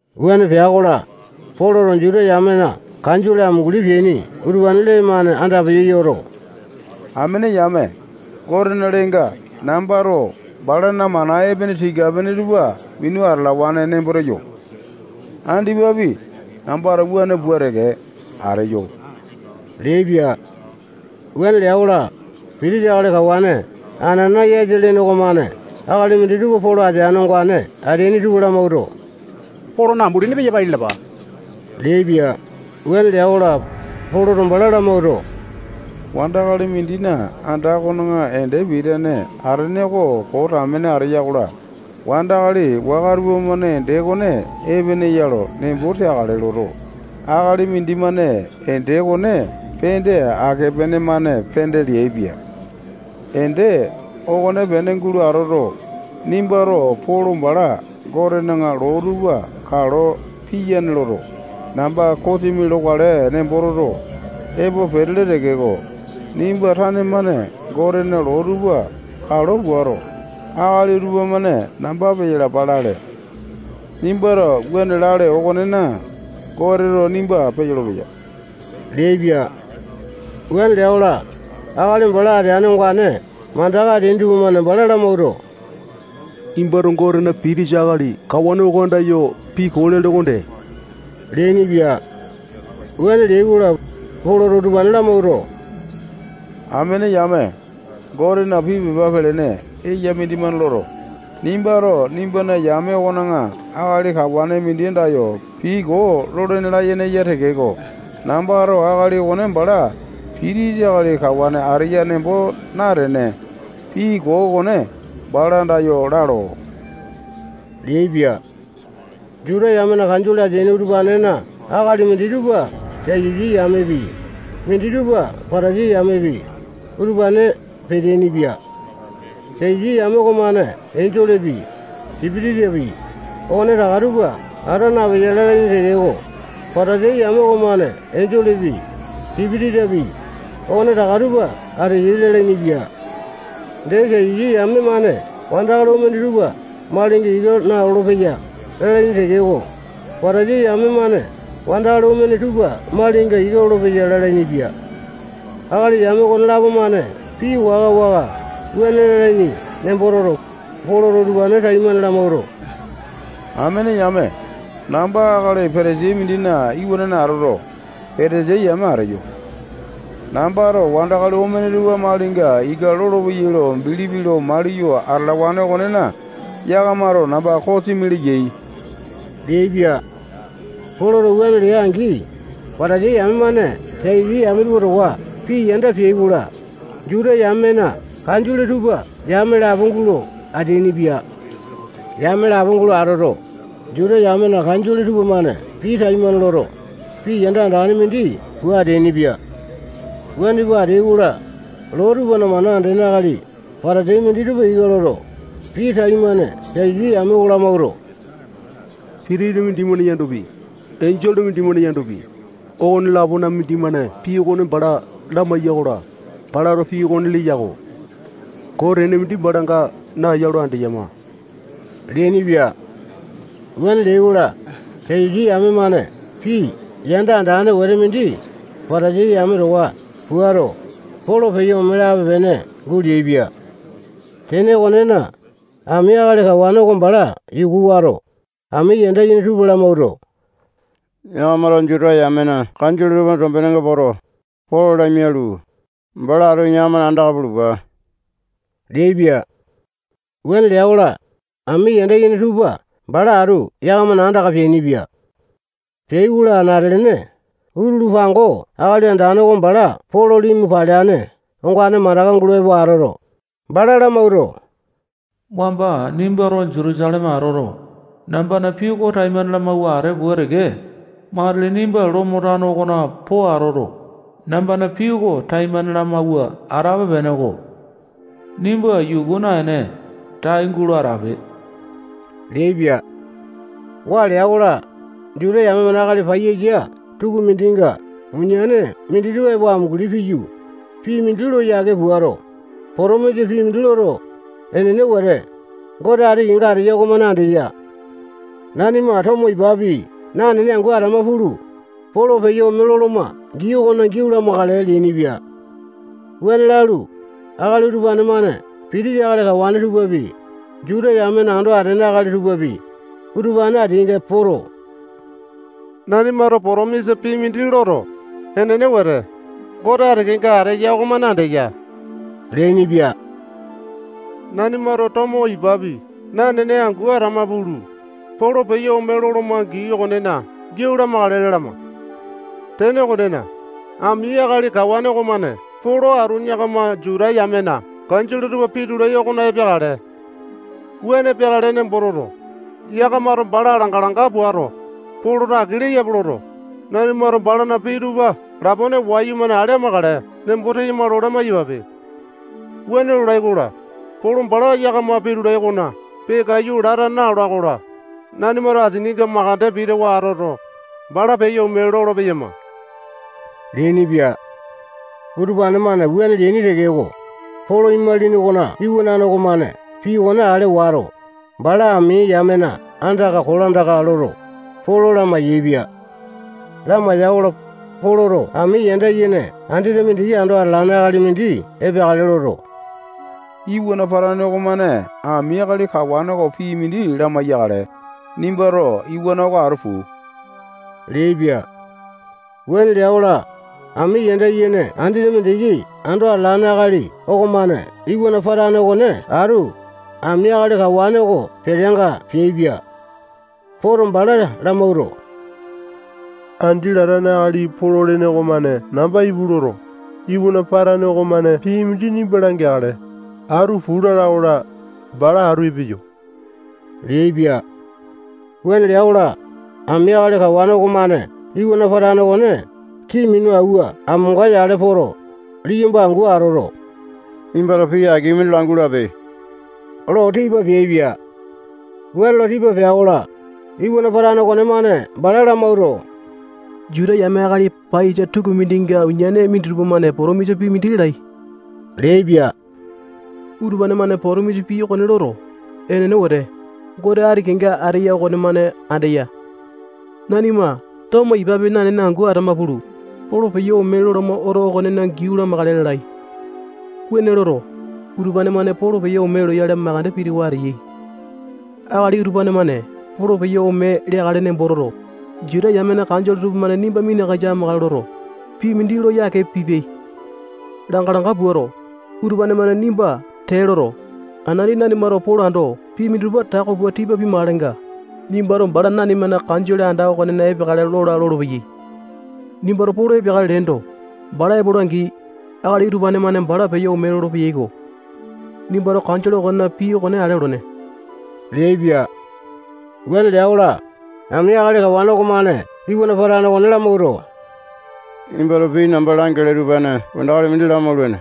Wuane pea-kola, Poloto Juta yamena kanjole amunguli peaini utupane lee-mane andapeyo yoto, amene yame, Gotena leenga nambato balana mana epene tika-pene tupa minu atalawane nembo teyo. Andipapi, nambato wuane pua teke ateyo leaipia. Wuane lea-kola, pitisa akali kawane Anana-yasa lene okomane akali minditupa Polo ateane ongane ateaini tupa lamawuato, Polona ambulini peyo pai lalapa leaipia. Wuane lea-kola, Poloto bala lamawuato, wandakali mindina anda okona ende pitane atene oko koo tamene ateya-kola, wandakali waka tupamane ende okone epene ya lo nembo teakale loto, akali mindimane ende okone pende ake pene-mane pende leaipia. Ende okonepene gulo atoto, nimbato Polo bala Gotena loo tupa kalo piyane loto, namba kosimi lokale nembo toto, epo petele tekeko, nimba tane-mane Gotena loo tupa kalo puato, akali utupa-mane namba peyalapa lale. Nimbato wuane lale okonena, Goteto nimba peyolo-peya leaipia. Wuane lea-kola, akali bala ateane ongane mandaka ateaini tupamane bala lamawuato, nimbato Gotena pitisa akali kawane oko andayo pii koo lele okonde leainipia. Wuane leai-kola, Poloto utupane lamawuato, amene yame, Gotena pii pepa pelene eya mindimane loto, nimbato nimbana yame okona akali kawane mindi andayo pii koo lolene layene eya tekeko, nambato akali okone bala pitisa akali kawane ateya nembo natene, pii koo okone bala andayo lalo leaipia. Juta yamena Kanjole ateaini utupanena akali minditupa Satusi yamepi, minditupa Patasai yamepi, utupane peteaini-pia. Satusi yame okomane enjolepi, sipitisapi, okonetaka tupa ata napeya lalaini tekeko, Patasai yame okomane enjolepi, sipitisapi, okonetaka tupa ateyai lalainipia. Dee, Satusi yame-mane wandakali omene tupa malinga ika nalolo-peyai lalaini tekeko, Patasai yame-mane wandakali omene tupa malinga ika lolopeyai lalainipia. Akali yame okonelapo-mane pii waka-waka wuane lalaini nembo toto, Poloto utupane taimane lamawuato, amene yame, namba akali Patasai mindina iwanane atoto, Patasai yame ateyo. Nambato wandakali omene tupa malinga ika lolopeyai lo bilipi lo maliyo atalawane okonena, yakamato namba kosimi leyai leaipia. Poloto wuane lea-angi, Patasai yame-mane Satusi yame tupa towa pii yanda peai-kola, Juta yamena kanjole tupa yame lapo gulo ateainipia. Yame lapo gulo atoto, Juta yamena kanjole tupamane pii taimane loto, pii yanda andane mindi pua ateainipia. Wuane pua ateai-kola, loo tupana mana andene akali Patasai minditupa ika loto, pii taimane Satusi yame oko lamawuato, sipitisa mindimane yandopi, enjole mindimane yandopi, okone-lapona mindimane pii okone bala lamaiya-kola, balato pii okone leya-ko. Koo tene mindi balanga naeya lo andeyama leainipia. Wuane leai-kola, Satusi yame-mane pii yanda andane wete mindi Patasai yame towa puato, Polo peyo ome lape-pene guleaipia. Tene okonena, ami akali kawane oko bala yuku wato, ami yanda yene tupa lamawuato, yakamato Juta yamena kanjole tupana tombenenga poto, Polo lamialu, bala atu yakamana andaka pulupa leaipia. Wuane lea-kola, ami yanda yene tupa bala atu yakamana andaka peainipia. Peai-kola, anate-lene utulu pango Akali Andane oko bala Polo limu paleane ongane mandaka gulo epo atoto, bala lamawuato, wamba nimbato Jutusaleme atoto, nambana pii oko taimane lamawua atee pua teke, matili nimba Lomo tano okona po atoto, nambana pii oko taimane lamawua atape-peneko. Nimba yuku naene, tai gulo atape leaipia. Waa lea-kola, Juta yame akali paiyasa tukumindinga uniane minditupa epo amunguli piyu, pii mindi lo yake puato, potomisa pii mindi loto, enene wete, Gote ati kenga ateya okomane andeya. Nanima tomo ipapi nanene angu atama pulu, Polo peyo ome loloma gii okonena giau lamakale leainipia. Wuane lalu, akali utupane-mane pitisa akali kawane tupapi, Juta yamena ando atene akali tupapi, utupane ateainga poto, nanimato potomisa pii mindi loto, enene wete, Gote ati kenga ateya okomane andeya leainipia. Nanimato tomo ipapi nanene angu atama pulu, Polo peyo ome loloma gii okonena giau lamakale lalama. Tene okonena, ami akali kawane okomane Polo atu yakama Juta yamena kanjole tupa pitulai okona epeakale. Wuane peakale nembo toto, yakamato bala langa-langa puato, Poloto aki leyape loto, nanimato balana pii tupa lapone wayumane ale amakale nembo teyama lo lamai-yapape. Wuane lolai-kola, Polo bala yakama pitulai okona peakaiyu lata naola-kola, nanimato asininga makande pitawa atoto, bala peyo ome lolo-peyama leainipia. Utupane-mane wuane leaini tekeko, Polo imalini okona iwanane okomane pii okone ale wato, bala ami yamena andaka kolandaka loto, Polo lamai-yaepia. Lamaiya-kola, Poloto ami yanda yene andete mindiki ando atalane akali mindi epeakale loto, iwana patane okomane ami akali kawane oko pii mindi lamai-yakale, nimbato iwana oko atu puu leaipia. Wuane lea-kola, ami yanda yene andete mindiki ando atalane akali okomane iwana patane okone atu, ami akali kawane oko peteanga peaipia. Poto, bala lamawuato, andi latane akali Polo lene okomane namba ipu loto, iwana patane okomane pii mindi nimba langeakale, atu puu lala-kola, bala atu epeyo leaipia. Wuane lea-kola, ami akali kawane okomane iwana patane okone kii minu awua amonga yale poto, liyamba angu atoto, nimbato pii aki mindi langulape lo tipa peaipia. Wuane lo tipa pea-kola, iwana patane okonemane bala lamawuato, Juta yame akali paiyasa tukumindinga uniane minditupa-mane potomisa pii mindi lalai leaipia. Utupane-mane potomisa pii okone loto, enene wete, Gote ati kenga ateya okomane andeya. Nanima tomo ipapi nanene angu atama pulu, Polo peyo ome loloma oto okonena giau lamakale lalai. Wuane loto, utupane-mane Polo peyo ome loyale makande pitawa ateyai. Akali utupane-mane Polo peyo ome leakale nembo toto, Juta yamena kanjole tupamane nimba minakasa amakale loto, pii mindi lo yake pipiai. Langa-langa puato, utupane-mane nimba tee loto, anati nanimato Polo ando pii minditupa tako pua tipa pimakalenga, nimbato bala nanimana kanjole anda okona epeakale lola lolopeyai. Nimbato Polo epeakale leendo, bala epola-angi, akali utupane-mane bala peyo ome lolo-peyaiko. Nimbato kanjole okona pii okone ale olene leaipia. Wuane lea-kola, ami akali kawane okomane iwana patane okone lamawuato, nimbato pii namba langele utupane wandakali mindi lamaulene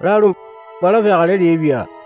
lalu, bala peakale leaipia.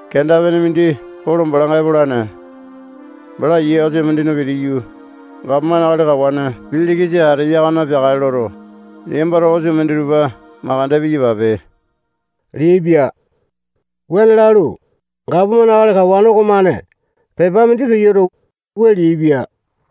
Kenda-pene mindi Polo balanga epolane. Bala yia osa mindina pitiyu, gapomane akali kawane Pilikisa ateya okona peakale loto, liyambato osa minditupa mandeke piyapape leaipia. Wuane lalu, gapomane akali kawane okomane pepa mindi peyoto, wua leaipia: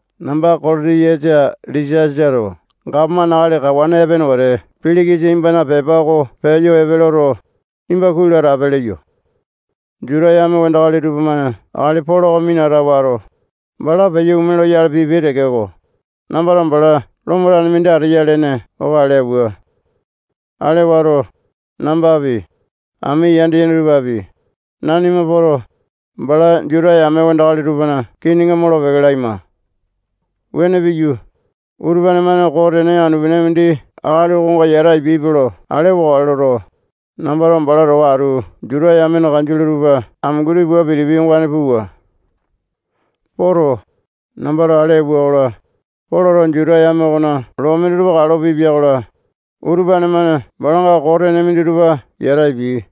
Namba Kolotiyasa Lisiasato gapomane akali kawane epene wete Pilikisa nimbana pepa oko peyo epe loto, nimba kuai lo atape leyo. Juta yame wandakali tupamane akali Polo oko minata wato, bala peyo ome loyale pipiai tekeko, nambato bala Lomo tane mindi ateya lene oko ale auwa. Ale wato, nambapi, ami yanda yene tupapi, nanima poto, bala Juta yame wandakali tupana kininga molo-peke laima. Wuane piyu, utupane-mane koo tene anu-pene mindi akali okonga yata apiaipe lo ale wakale loto, nambato bala towa atu Juta yamena kanjole tupa amunguli pua pitipia ongane puwa. Poto, nambato ale auwa-kola, Poloto Juta yame okona loo minditupa kalo pipia-kola, utupane-mane balanga koo tene minditupa yata apiai.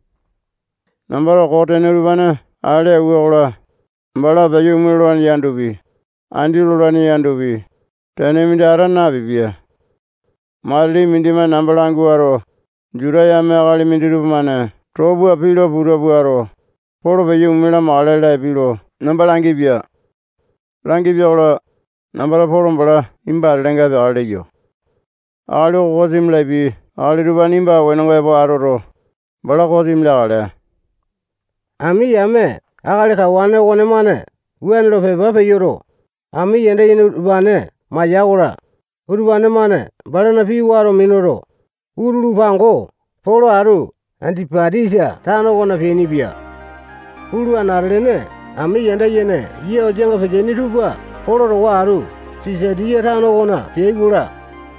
Nambato koo tene utupane ale auwa-kola, bala peyo ome lolane yandopi, andi lolane yandopi, tene mindi ata napipia. Matili mindimane namba languato, Juta yame akali minditupa-mane too pua pii lo puta puato, Polo peyo ome lamakale lapiai lo namba langipia. Langipia-kola, nambato Polo bala nimba atelenga epeakale leyo. Akali oko kosimi lapiai akali utupane nimba wenonga epo atoto, bala kosimi leakale. Ami yame akali kawane okonemane wuane lo pepa peyoto, ami yanda yene utupane maiya-kola, utupane-mane balana pii wato minuto, utulu pango Polo atu Andipatisa tano okona peainipia. Pulu, anate-lene ami yanda yene yia osanga peteaini tupa Polo towa atu Sisatiya tano okona peai-kola,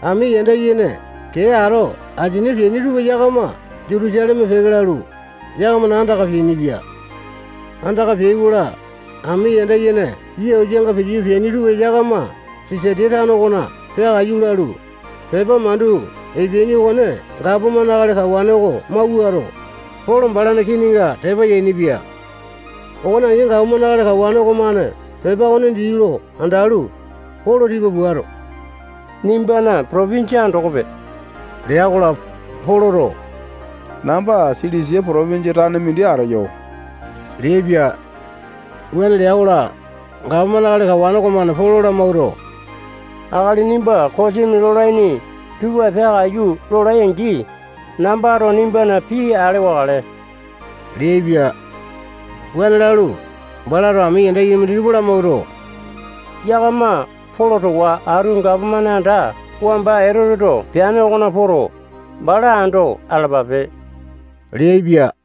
ami yanda yene kee ato asini peaini tupa yakama Jutusaleme peke lalu, yakamana andaka peainipia. Andaka peai-kola, ami yanda yene yia osanga pitiyu peaini tupa yakama Sisatiya tano okona peakaiyu lalu, pepa mandu epeaini okone gapomane akali kawane oko mawuato, Polo balana kininga tepa yainipia. Okone angi, gapomane akali kawane okomane pepa okone dii lo andalu, Polo tipa puato, nimbana potopinjia andokope lea-kola, Poloto namba Silisia potopinjia tane mindi ateyo leaipia. Wuane lea-kola, gapomane akali kawane okomane Polo lamawuato, akali nimba kosimi lolaini tupa peakaiyu lolai-angi, nambato nimbana pii ale wakale leaipia. Wuane lalu, balato ami yanda yene minditupa lamawuato, yakama Polo towa atu gapomane anda wamba Etoteto peane okona poto, bala ando atalapape leaipia.